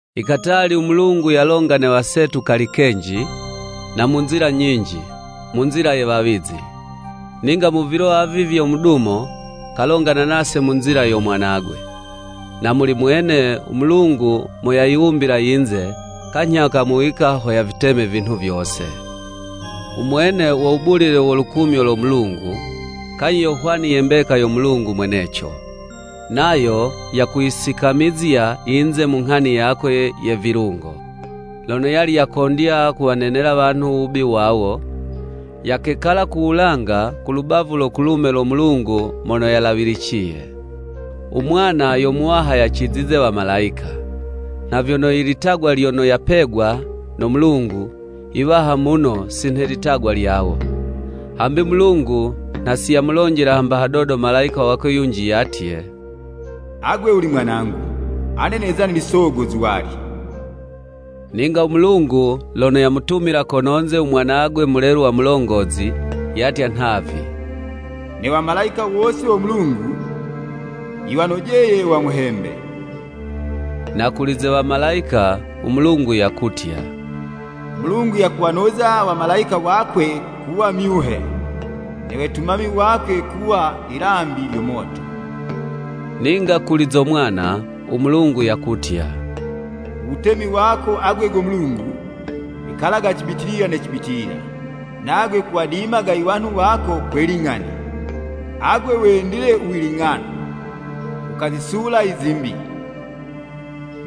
I katali u Mulungu yalonga ne wasetu kali kenji, na mu nzila nyinji, mu nzila ye wawizi, ninga mu vilo avi vyo mudumo, kalongana nase mu nzila yo Mwanagwe. Na muli mwene, u Mulungu mo yayiwumbila yinze, kanyhi yakamuwika ho yaviteme vinhu vyose. U mwene wo wubulile wo lukumyo lo Mulungu, kanyhi yo hwani ye mbeka yo Mulungu mweneco, nayo yakuyisikamizya yinze mu nghani yakwe ye vilungo. Lono yali yakondya kuwanenela wanhu u wubi wawo, yakekala ku wulanga ku lubavu lo kulume lo Mulungu Mono Yalawiliciye. U Mwana yo muwaha yacizize wa malayika, nha vyono i litagwa lyono yapegwa no Mulungu, yiwaha muno si nhe litagwa lyawo. Hambi u Mulungu nha si yamulonjela hamba hadodo malayika wakwe yunji yatye, “Agwe wuli Mwanangu, Ane neza nili sogo zuwali?” Ninga u Mulungu lono yamutumila kononze u Mwanagwe mulelwa mulongozi, yatya nhavi, “Ne wamalayika wose wo Mulungu, yiwanojeye wamuhembe.” Na kuli ze wamalayika, u Mulungu yakutya, “U Mulungu yakuwanoza wamalayika wakwe kuwa myuhe, ne wetumami wakwe kuwa lilambi lyo moto.” Ninga kuli zo Mwana, u Mulungu yakutya, “U wutemi wako agwe go Mulungu, wikalaga cibitilila ne cibitilila. Nagwe kuwadimaga i wanhu wako kwe ling'ani. Agwe wendile u wiling'ano, wukazisula i zimbi.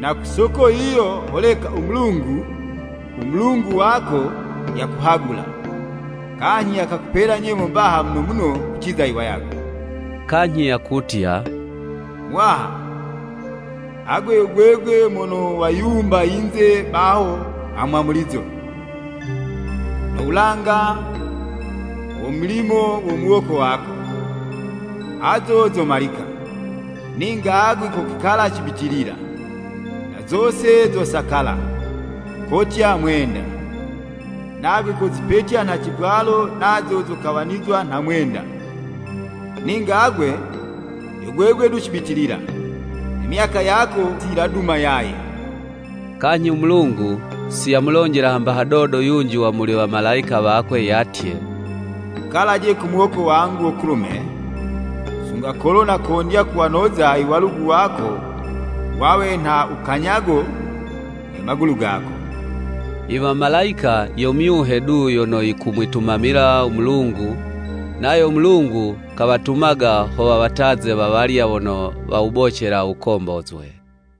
Na ku soko yiyo holeka u Mulungu, u Mulungu wako yakuhagula, kanyhi yakakupela nyemo mbaha muno muno kuciza i wayago.” Kanyhi yakutya, “Muwaha, agwe yo gwegwe mono wayiwumba yinze baho ha mwamulizo, no wulanga wo mulimo wo muwoko wako, Azo zomalika, ninga agwe kokwikala cibitilila, na zose zosakala kotya mwenda, Nagwe kozipetya nha civwalo nazo zokawanizwa nha mwenda, ninga agwe, yo gwegwe du cibitilila, ne myaka yako si yiladuma yaye.” Kanyhi u Mulungu si yamulonjela hamba hadodo yunji wa muli wamalayika wakwe yatye, “Wikalaje ku muwoko wangu wo kulume sunga kolo nakondya kuwanoza i walugu wako wawe nha wukanyago we magulu gako.” I Wamalayika, yo myuhe du yono yikumwitumamila u Mulungu, nayo u Mulungu kawatumaga ho wawataze wawalya wono wowubocela u wukombozwe.